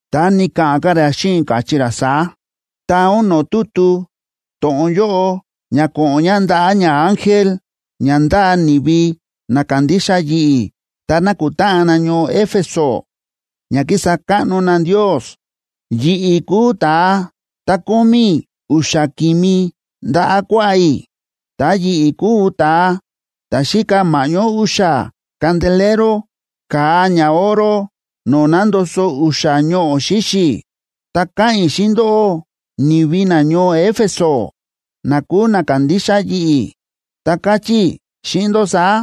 Ta ni̱ka̱ꞌa̱n ka̱ ra xíꞌin i̱, káchí ra saá: ―Taa ún no̱o̱ tutu to̱ꞌon yóꞌo ña ko̱ꞌo̱n ña ndaꞌa̱ ñaángel ña ndáa ni̱vi na kándixa yi̱ꞌi̱ ta nákutáꞌan na ñoo Éfeso ña kísa káꞌno na Ndios: “Yi̱ꞌi̱ kúu ta̱a ta̱ kómí u̱xa̱ ki̱mi ndaꞌa̱ kuaꞌá i̱, ta yi̱ꞌi̱ kúu ta̱a ta̱ xíka ma̱ꞌñó u̱xa̱ candelero ka̱a ñaoro no̱o̱ nándoso u̱xa̱ ñoꞌo̱ xíxi̱, ta káꞌa̱n i̱ xíꞌin ndóꞌó, ni̱vi nañoo Éfeso na kúu na kándixa yi̱ꞌi̱, ta káchí i̱ xíꞌin ndó saá: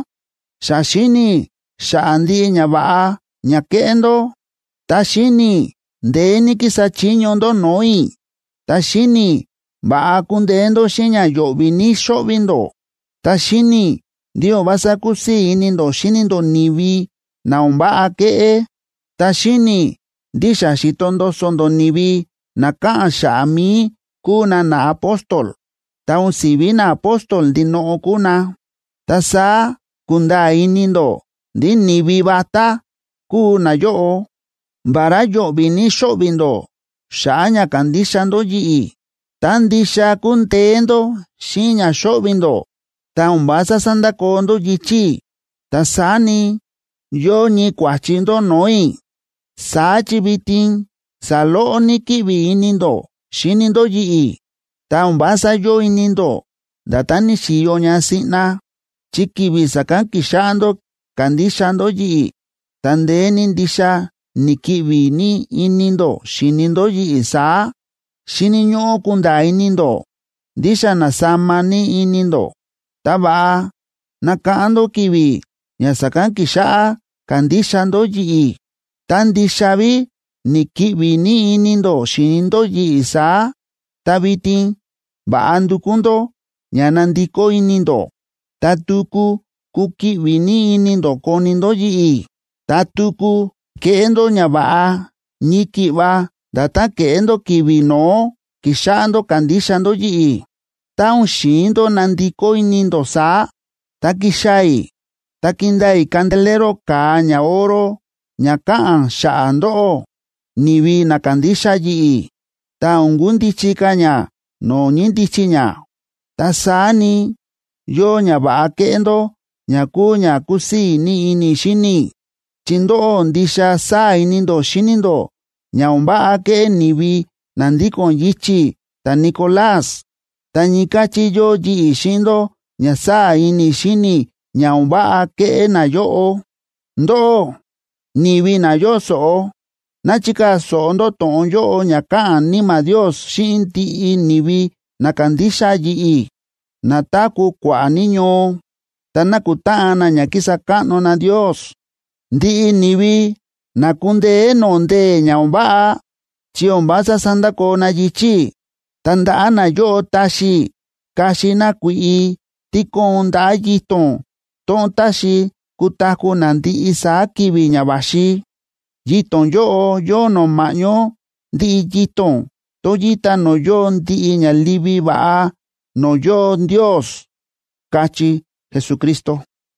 Xa xíni̱ i̱ xa̱ꞌa̱ ndiꞌi ñava̱ꞌa ña kéꞌé ndó, ta xíni̱ i̱ ndeé ní kísa chiño ndó no̱o̱ i̱, ta xíni̱ i̱ va̱ꞌa kúndeé ndó xíꞌin ña yo̱ꞌvi̱ ní xóꞌvi̱ ndó. Ta xíni̱ i̱ ndí o̱n vása kúsii̱ ini ndó xíni ndó ni̱vi na o̱n váꞌa kéꞌé. Ta xíni̱ i̱ ndí xa xi̱to ndoso ndó ni̱vi na káꞌa̱n xa̱ꞌa̱ mi̱i kúu na naapóstol, ta o̱n si̱ví naapóstol ndinoꞌo kúu na. Ta saá ku̱nda̱a̱ ini ndó ndí ni̱vi vatá kúu nayóꞌo. Vará yo̱ꞌvi̱ ní xóꞌvi̱ ndó xa̱ꞌa̱ ña kándixa ndó yi̱ꞌi̱, ta ndixa kúndeé ndó xíꞌin ña xóꞌvi̱ ndó, ta o̱n vása sándakoo ndó yichi̱ i̱. Ta saá ni, yóo ñii kua̱chi ndó no̱o̱ i̱. Saá chi vitin saloꞌo ní kíꞌvi ini ndó xíni ndó yi̱ꞌi̱, ta o̱n vása yóo ini ndó nda̱tán ni̱xi̱yo ña siꞌna, chi ki̱vi̱ sa̱kán ki̱xáꞌá ndó kándixa ndó yi̱ꞌi̱, ta ndeé ní ndixa ni̱kiꞌvi ní ini ndó xi̱ni ndó yi̱ꞌi̱ saá. Xíni̱ ñóꞌó kunda̱a̱ ini ndó ndí xa na̱sama ní ini ndó. Ta va̱ꞌa nakáꞌán ndó ki̱vi̱ ña sa̱kán ki̱xáꞌá kándixa ndó yi̱ꞌi̱, ta ndixa ví ni̱kiꞌvi ní ini ndó xíni ndó yi̱ꞌi̱ saá. Ta vitin va̱ꞌa ndukú ndó ña nandikó ini ndó, ta tuku kukiꞌvi ní ini ndó koni ndó yi̱ꞌi̱, ta tuku keꞌé ndó ñava̱ꞌa ñii ki̱ꞌva nda̱tán ke̱ꞌé ndó ki̱vi̱ no̱ó ki̱xáꞌá ndó kándixa ndó yi̱ꞌi̱. Tá o̱n xi̱in ndó nandikó ini ndó saá, ta kixaa̱ i̱ ta kindaa i̱ candelero ka̱a ñaoro ña káꞌa̱n xa̱ꞌa̱ ndóꞌó, ni̱vi na kándixa yi̱ꞌi̱, ta o̱n kundichi ka̱ ña no̱o̱ ñíndichi ña. Ta saá ni, yóo ñava̱ꞌa kéꞌé ndó ña kúu ña kúsii̱ ní ini i̱ xíni i̱, chi ndóꞌó ndixa sáa̱ ini ndó xíni ndó ña o̱n váꞌa kéꞌé ni̱vi na ndíko̱n yichi̱ ta̱Nicolás, ta ñii káchí yóo yi̱ꞌi̱ xíꞌin ndó ña sáa̱ ini i̱ xíni i̱ ña o̱n váꞌa kéꞌé nayóꞌo. Ndóꞌó, ni̱vi na yóo so̱ꞌo, ná chikaa̱ so̱ꞌo ndó to̱ꞌon yóꞌo ña káꞌa̱n Níma̱ Ndios xíꞌin ndiꞌi ni̱vi na kándixa yi̱ꞌi̱, na táku̱ kua̱ꞌa̱ ní ñoo, ta nákutáꞌan na ña kísa káꞌno na Ndios. Ndiꞌi ni̱vi na kundeé no̱o̱ ndee̱ ña o̱n váꞌa, chi o̱n vása sandakoo na yichi̱ i̱, ta ndaꞌa̱ nayóꞌo taxi i̱ kaxi na kui̱ꞌi tí kóon ndaꞌa̱ yito̱n tón táxi kutaku̱ na ndiꞌi saá ki̱vi̱ ña va̱xi. Yito̱n yóꞌo yóo nó ma̱ꞌñó ndiꞌi yito̱n tón yíta no̱o̱ yóo ndiꞌi ña livi va̱ꞌa, no̱o̱ yóo Ndios” ―káchí Jesucristo.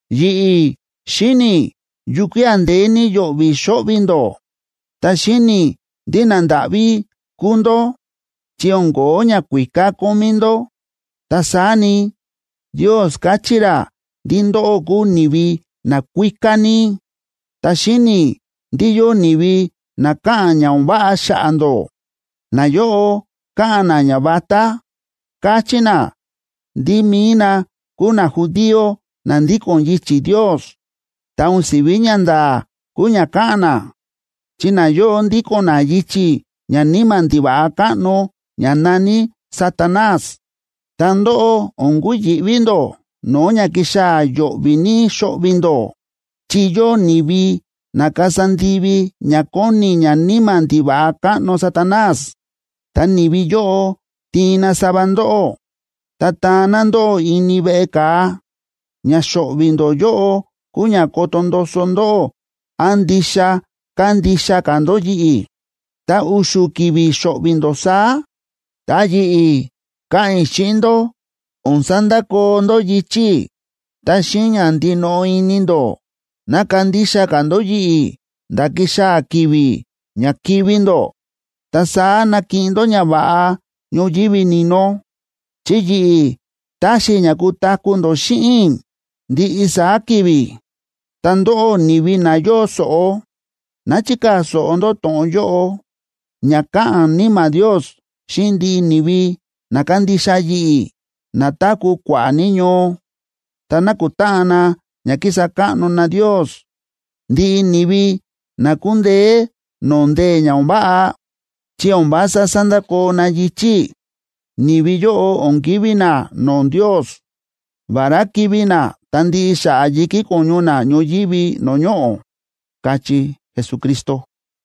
Yi̱ꞌi̱ xíni̱ i̱ yukía̱ ndeé ní yo̱ꞌvi̱ xo̱ꞌvi̱ ndó, ta xíni̱ i̱ ndí nandáꞌví kúu ndó, chi o̱n ko̱ó ñakuíká kómí ndó. Ta saá ni, Ndios káchí ra ndí ndóꞌó kúu ni̱vi nakuíká ní. Ta xíni̱ i̱ ndí yóo ni̱vi na káꞌa̱n ña o̱n váꞌa xa̱ꞌa̱ ndó. Nayóꞌo káꞌa̱n na ñavatá, káchí na ndí mi̱i na kúu najudío na ndíko̱n yichi̱ Ndios, ta o̱n si̱ví ñanda̱a̱ kúu ña káꞌa̱n na, chi nayóꞌo ndíko̱n na yichi̱ ñaníma̱ ndiva̱ꞌa káꞌno ña na̱ní Satanás. Ta ndóꞌó, o̱n kuyi̱ꞌví ndó no̱o̱ ña kixaa̱ yo̱ꞌvi̱ ní xo̱ꞌvi̱ ndó. Chi yóo ni̱vi na kasa ndivi ña kóni ñaníma̱ ndiva̱ꞌa káꞌno Satanás, ta ni̱vi yóꞌo tiin na sava ndóꞌó, ta taan na ndóꞌó ini veꞌe ka̱a. Ña xo̱ꞌvi̱ ndó yóꞌo kúu ña koto ndoso ndóꞌó án ndixa kandixa ka̱ ndó yi̱ꞌi̱, ta u̱xu̱ ki̱vi̱ xo̱ꞌvi̱ ndó saá. Ta yi̱ꞌi̱ káꞌa̱n i̱ xíꞌin ndó o̱n sandakoo ndó yichi̱ i̱, ta xíꞌin ña ndinoꞌo ini ndó ná kandixa ka̱ ndó yi̱ꞌi̱ nda̱ kixaa̱ ki̱vi̱ ña kivi̱ ndó. Ta saá nakiꞌin ndó ñava̱ꞌa ñoyívi ni̱no, chi yi̱ꞌi̱ taxi i̱ ña kutaku̱ ndó xíꞌin i̱ ndiꞌi saá ki̱vi̱. Ta ndóꞌó, ni̱vi na yóo so̱ꞌo, ná chikaa̱ so̱ꞌo ndó to̱ꞌon yóꞌo ña káꞌa̱n Níma̱ Ndios xíꞌin ndiꞌi ni̱vi na kándixa yi̱ꞌi̱, na táku̱ kua̱ꞌa̱ ní ñoo, ta nákutáꞌan na ña kísa káꞌno na Ndios. Ndiꞌi ni̱vi na kundeé no̱o̱ ndee̱ ña o̱n váꞌa, chi o̱n vása sandakoo na yichi̱ i̱, ni̱vi yóꞌo o̱n kivi̱ na no̱o̱ Ndios, vará kivi̱ na ta ndiꞌi xa̱ꞌa̱ yi̱kí ko̱ñu na ñoyívi no̱o̱ ñoꞌo̱” ―káchí Jesucristo.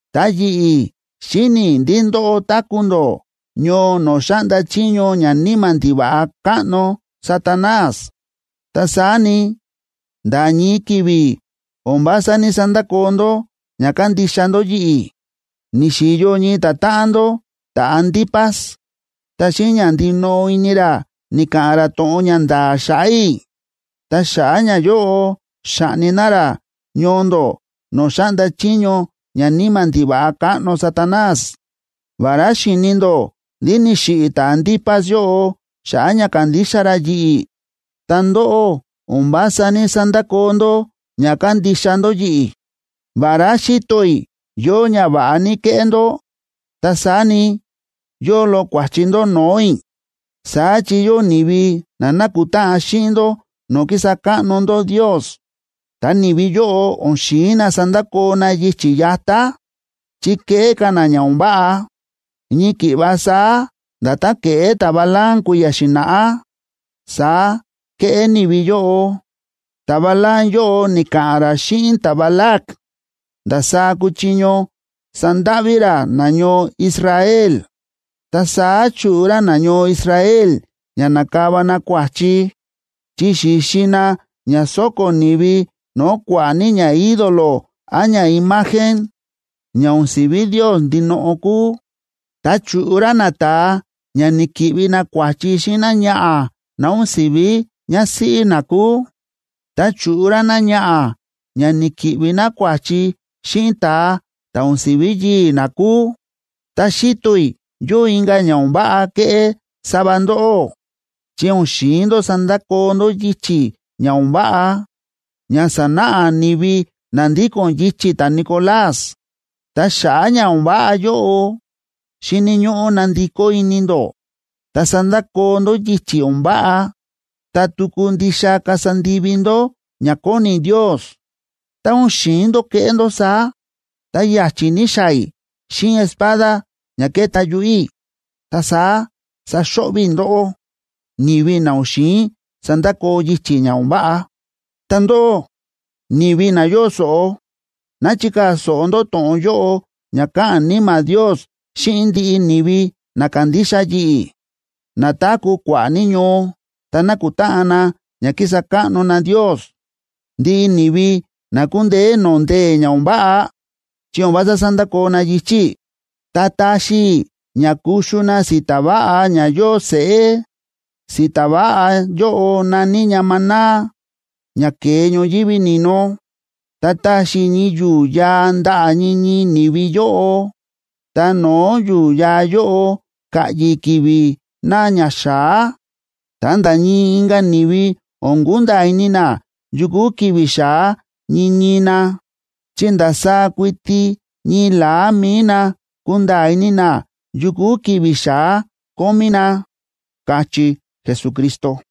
Ta yi̱ꞌi̱ xíni̱ i̱ ndí ndóꞌó táku̱ ndó ñoo no̱o̱ xa̱ꞌnda chiño ñaníma̱ ndiva̱ꞌa káꞌno Satanás. Ta saá ni, nda̱ ñii ki̱vi̱ o̱n vása ní‑sandakoo ndó ña kándixa ndó yi̱ꞌi̱. Ni̱xi̱yo ñii ta̱táꞌan ndó ta̱Antipas, ta xíꞌin ña ndinoꞌo ini ra ni̱ka̱ꞌa̱n ra to̱ꞌon ña nda̱a̱ xa̱ꞌa̱ i̱, ta xa̱ꞌa̱ ñayóꞌo xa̱ꞌni na ra ñoo ndó no̱o̱ xáꞌnda chiño ñaníma̱ ndiva̱ꞌa káꞌno Satanás. Vará xíni̱ ndó ndí ni̱xiꞌi̱ ta̱Antipas yóꞌo xa̱ꞌa̱ ña kándixa ra yi̱ꞌi̱, ta ndóꞌó o̱n vása ní‑sandakoo ndó ña kándixa ndó yi̱ꞌi̱. Vará xíto i̱ yóo ñava̱ꞌa ní kéꞌé ndó, ta saá ni, yóo loꞌo kua̱chi ndó no̱o̱ i̱. Saá chi yóo ni̱vi na nákutáꞌan xíꞌin ndó no̱o̱ kísa káꞌno ndó Ndios, ta ni̱vi yóꞌo o̱n xi̱in na sandakoo na yichi̱ yatá, chi kéꞌé ka̱ na ña o̱n váꞌa. Ñii ki̱ꞌva saá nda̱tán ke̱ꞌé ta̱Balaam kui̱ya̱ xi̱na̱ꞌá, saá kéꞌé ni̱vi yóꞌo. Ta̱Balaam yóꞌo ni̱ka̱ꞌa̱n ra xíꞌin ta̱Balac ndasaá kuchiño sandáꞌví ra nañoo Israel. Ta saá chu̱ꞌu ra nañoo Israel ña na̱kava na kua̱chi, chi xi̱xi na ña sóko̱ ni̱vi no̱o̱ kua̱ꞌa̱ ní ñaídolo án ñaimagen, ña o̱n si̱ví Ndios ndinoꞌo kúu. Ta chu̱ꞌu ra nata̱a ña ni̱ki̱ꞌvi na kua̱chi xíꞌin náñaꞌa̱ ná o̱n si̱ví ñásíꞌí na kúu. Ta chu̱ꞌu ra náñaꞌa̱ ña ni̱ki̱ꞌvi ná kua̱chi xíꞌin ta̱a ta̱ o̱n si̱ví yii̱ ná kúu. Ta xíto i̱ yóo inka̱ ña o̱n váꞌa kéꞌé sava ndóꞌó, chi o̱n xi̱in ndó sandakoo ndó yichi̱ ña o̱n váꞌa ña sánáꞌa ni̱vi na ndíko̱n yichi̱ ta̱Nicolás. Ta xa̱ꞌa̱ ña o̱n váꞌa yóꞌo, xíni̱ ñóꞌó nandikó ini ndó, ta sandakoo ndó yichi̱ o̱n váꞌa, ta tuku ndixa kasa ndivi ndó ña kóni Ndios. Tá o̱n xi̱in ndó keꞌé ndó saá, ta ya̱chi̱ ní xaa̱ i̱ xíꞌin espada ña kéta yuꞌu̱ i̱, ta saá saxo̱ꞌvi̱ i̱ ndóꞌó, ni̱vi na o̱n xi̱in sandakoo yichi̱ ña o̱n váꞌa. Ta ndóꞌó, ni̱vi na yóo so̱ꞌo, ná chikaa̱ so̱ꞌo ndó to̱ꞌon yóꞌo ña káꞌa̱n Níma̱ Ndios xíꞌin ndiꞌi ni̱vi na kándixa yi̱ꞌi̱, na táku̱ kua̱ꞌa̱ ní ñoo, ta nákutáꞌan na ña kísa káꞌno na Ndios. Ndiꞌi ni̱vi na kundeé no̱o̱ ndee̱ ña o̱n váꞌa, chi o̱n vása sandakoo na yichi̱ i̱, ta taxi i̱ ña kuxu na si̱ta̱ váꞌa ña yóo seꞌé. Si̱ta̱ váꞌa yóꞌo na̱ní ña maná ña ke̱e ñoyívi ni̱no. Ta taxi i̱ ñii yu̱u̱ yaa ndaꞌa̱ ñii ñii ni̱vi yóꞌo, ta no̱o̱ yu̱u̱ yaa yóꞌo ka̱ꞌyi̱ ki̱vi̱ na ña xa̱á. Ta nda̱ ñii inka̱ ni̱vi o̱n kunda̱a̱ ini na yu kúu ki̱vi̱ xa̱á ñii ñii na, chi ndasaá kuiti ñii la̱á mi̱i na kunda̱a̱ ini na yu kúu ki̱vi̱ xa̱á kómí na” ―káchí Jesucristo.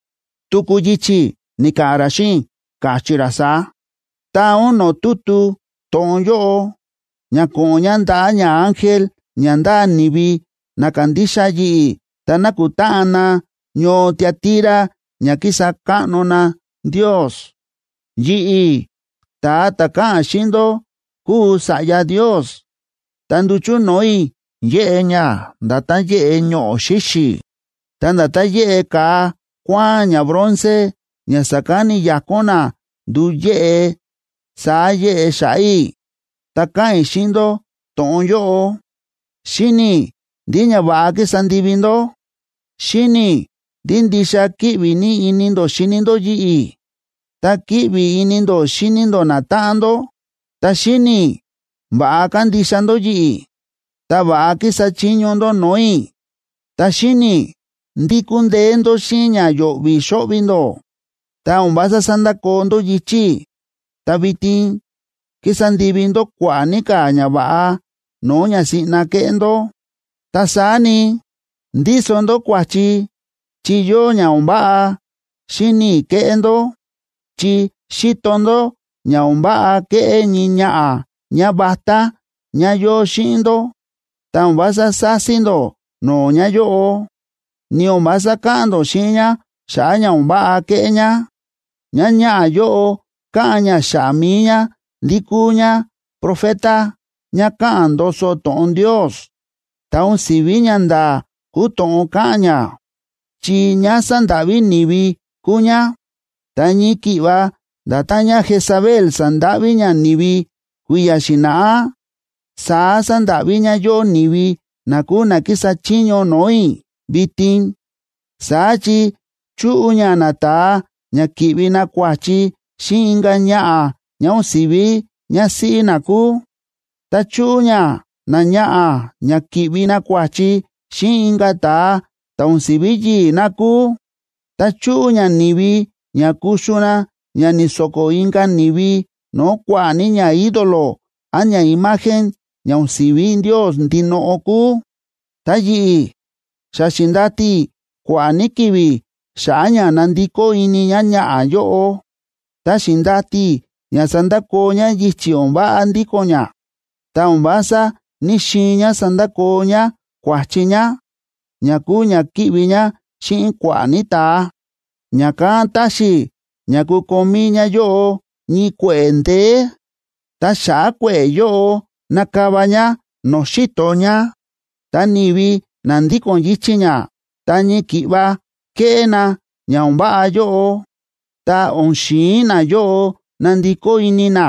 Tuku yichi̱ ni̱ka̱ꞌa̱n ra xíꞌin i̱, káchí ra saá: ―Taa ún no̱o̱ tutu to̱ꞌon yóꞌo ña ko̱ꞌo̱n ña ndaꞌa̱ ñaángel ña ndáa ni̱vi na kándixa yi̱ꞌi̱ ta nákutáꞌan na ñoo Tiatira ña kísa káꞌno na Ndios: “Yi̱ꞌi̱, ta̱a ta̱ káꞌa̱n xíꞌin ndó kúu Sa̱ꞌya Ndios, ta nduchu̱ no̱o̱ i̱ yéꞌe ña nda̱tán yéꞌe ñoꞌo̱ xíxi̱. Ta nda̱tán yéꞌe ka̱a kuáán ñabronce, ña sa̱kán ni̱yakón na ndu̱u yéꞌe, saá yéꞌe xa̱ꞌa̱ i̱. Ta káꞌa̱n i̱ xíꞌin ndó to̱ꞌon yóꞌo: Xíni̱ i̱ ndiꞌi ñava̱ꞌa kísa ndivi ndó. Xíni̱ i̱ ndí ndixa kíꞌvi ní ini ndó xíni ndó yi̱ꞌi̱, ta kíꞌvi ini ndó xíni ndó natáꞌan ndó. Ta xíni̱ i̱ va̱ꞌa kándixa ndó yi̱ꞌi̱, ta va̱ꞌa kísa chiño ndó no̱o̱ i̱. Ta xíni̱ i̱ ndí kúndeé ndó xíꞌin ña yo̱ꞌvi̱ xóꞌvi̱ ndó, ta o̱n vása sándakoo ndó yichi̱ i̱, ta vitin kísa ndivi ndó kua̱ꞌa̱ ní ka̱ ñava̱ꞌa no̱o̱ ña siꞌna ke̱ꞌé ndó. Ta saá ni, ndíso ndó kua̱chi chi yóo ña o̱n váꞌa xíni̱ i̱ kéꞌé ndó. Chi xíto ndó ña o̱n váꞌa kéꞌé ñii ñaꞌa̱ ñávatá ñá yóo xíꞌin ndó, ta o̱n vása sási ndó no̱o̱ ñáyóꞌo, ni o̱n vása káꞌa̱n ndó xíꞌin ñá xa̱ꞌa̱ ña o̱n váꞌa kéꞌé ñá. Ñáñaꞌa̱ yóꞌo káꞌa̱n ñá xa̱ꞌa̱ mi̱i ñá ndí kúu ñá profeta ñá káꞌa̱n ndoso to̱ꞌon Ndios, ta o̱n si̱ví ñanda̱a̱ kúu to̱ꞌon káꞌa̱n ñá, chi ñá sándáꞌví ni̱vi kúu ñá. Ta ñii ki̱ꞌva nda̱tán ñáJezabel sa̱ndáꞌví ñá ni̱vi kui̱ya̱ xi̱na̱ꞌá, saá sándáꞌví ñáyóꞌo ni̱vi na kúu na kísa chiño no̱o̱ i̱ vitin. Saá chi chúꞌu ñá nata̱a ña ki̱ꞌvi na kua̱chi xíꞌin inka̱ ñaꞌa̱ ñá o̱n si̱ví ñásíꞌí na kúu, ta chúꞌu ñá náñaꞌa̱ ña ki̱ꞌvi ná kua̱chi xíꞌin inka̱ ta̱a ta̱ o̱n si̱ví yii̱ ná kúu. Ta chúꞌu ñá ni̱vi ña kuxu na ña ni̱so̱ko̱ inka̱ ni̱vi no̱o̱ kua̱ꞌa̱ ní ñaídolo án ñaimagen ña o̱n si̱ví Ndios ndinoꞌo kúu. Ta yi̱ꞌi̱, xa xi̱ndati i̱ kua̱ꞌa̱ ní ki̱vi̱ xa̱ꞌa̱ ña nandikó ini ñáñaꞌa̱ yóꞌo, ta xi̱ndati i̱ ña sandakoo ñá yichi̱ o̱n váꞌa ndíko̱n ñá, ta o̱n vása ní‑xiin ñá sandakoo ñá kua̱chi ñá, ña kúu ña kíꞌvi ñá xíꞌin kua̱ꞌa̱ ní ta̱a. Ña̱kán taxi i̱ ña kukomí ñáyóꞌo ñii kue̱ꞌe̱ ndeé, ta xa̱ꞌa̱ kue̱ꞌe̱ yóꞌo nakava ñá no̱o̱ xi̱to ñá. Ta ni̱vi na ndíko̱n yichi̱ ñá, ta ñii ki̱ꞌva kéꞌé na ña o̱n váꞌa yóꞌo, tá o̱n xi̱in nayóꞌo nandikó ini na,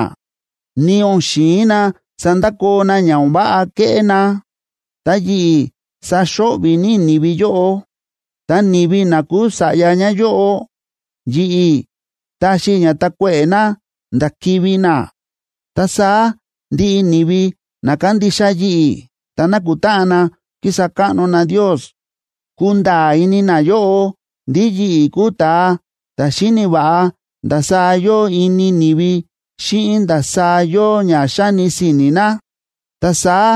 ni o̱n xi̱in na sandakoo na ña o̱n váꞌa kéꞌé na, ta yi̱ꞌi̱ saxo̱ꞌvi̱ ní i̱ ni̱vi yóꞌo. Ta ni̱vi na kúu sa̱ꞌya ñáyóꞌo, yi̱ꞌi̱ taxi i̱ ña takuéꞌe̱ na nda̱ kivi̱ na. Ta saá ndiꞌi ni̱vi na kándixa yi̱ꞌi̱ ta nákutáꞌan na kísa káꞌno na Ndios, kunda̱a̱ ini nayóꞌo ndí yi̱ꞌi̱ kúu ta̱a ta̱ xíni̱ va̱ꞌa ndasaá yóo ini ni̱vi xíꞌin ndasaá yóo ña xáni si̱ni̱ na. Ta saá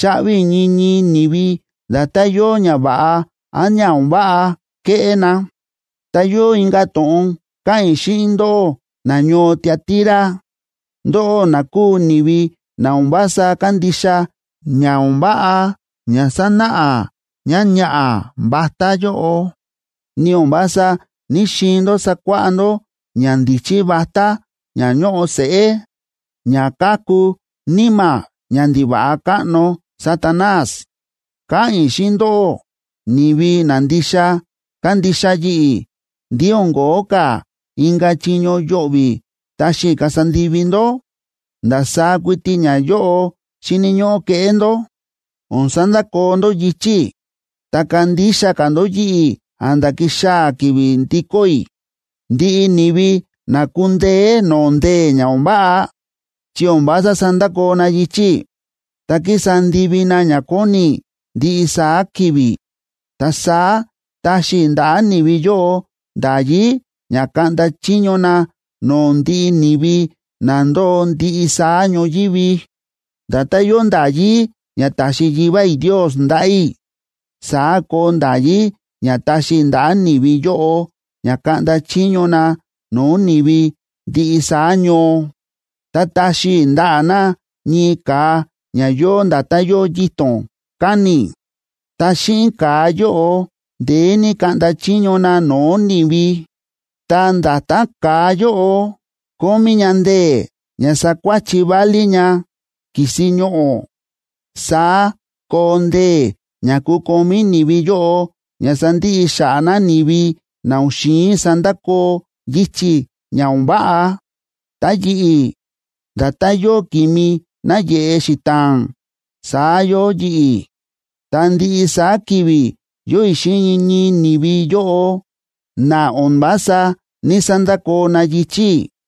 chaꞌvi i̱ ñii ñii ni̱vi nda̱tán yóo ña va̱ꞌa án ña o̱n váꞌa ke̱ꞌé na. Ta yóo inka̱ to̱ꞌon káꞌa̱n i̱ xíꞌin ndóꞌó nañoo Tiatira, ndóꞌó na kúu ni̱vi na o̱n vása kándixa ña o̱n váꞌa ña sa̱náꞌa ñáñaꞌa̱ vatá yóꞌo, ni o̱n vása ní‑xiin ndó sakuáꞌá ndó ñandíchí vatá ña ñóꞌo seꞌé, ña káku níma̱ ñandiva̱ꞌa káꞌno Satanás. Káꞌa̱n i̱ xíꞌin ndóꞌó, ni̱vi na ndixa kándixa yi̱ꞌi̱ ndí o̱n ko̱ó ka̱ inka̱ chiño yo̱ꞌvi̱ taxi i̱ kasa ndivi ndó. Ta ndasaá kuiti ñayóꞌo xíni̱ ñóꞌó keꞌé ndó: O̱n sandakoo ndó yichi̱ i̱, ta kandixa ka̱ ndó yi̱ꞌi̱ a̱nda̱ kixaa̱ ki̱vi̱ ndikó i̱. Ndiꞌi ni̱vi na kundeé no̱o̱ ndee̱ ña o̱n váꞌa, chi o̱n vása sandakoo na yichi̱ i̱, ta kísa ndivi na ña kóni i̱ ndiꞌi saá ki̱vi̱, ta saá taxi i̱ ndaꞌa̱ ni̱vi yóꞌo nda̱yí ña kaꞌnda chiño na no̱o̱ ndiꞌi ni̱vi na ndóo ndiꞌi saá ñoyívi. Nda̱tán yóo nda̱yí ña taxi Yivá i̱ Ndios ndaꞌa̱ i̱, saá koo nda̱yí ña taxi i̱ ndaꞌa̱ ni̱vi yóꞌo ña kaꞌnda chiño na no̱o̱ ni̱vi ndiꞌi saá ñoo. Ta taxi i̱ ndaꞌa̱ na ñii ka̱a ña yóo nda̱tán yóo yito̱n káni̱, ta xíꞌin ka̱a yóꞌo ndeé ní kaꞌnda chiño na no̱o̱ ni̱vi. Ta nda̱tán ka̱a yóꞌo kómí ña ndee̱ ña sakuáchi válí ña ki̱si ñoꞌo̱, saá koo ndee̱ ña kukomí ni̱vi yóꞌo ña sandiꞌi xa̱ꞌa̱ na ni̱vi na o̱n xi̱in sandakoo yichi̱ ña o̱n váꞌa. Ta yi̱ꞌi̱, nda̱tán yóo ki̱mi náyeꞌe xita̱a̱n saá yóo yi̱ꞌi̱, ta ndiꞌi saá ki̱vi̱ yóo i̱ xíꞌin ñii ñii ni̱vi yóꞌo na o̱n vása ní‑sandakoo na yichi̱ i̱.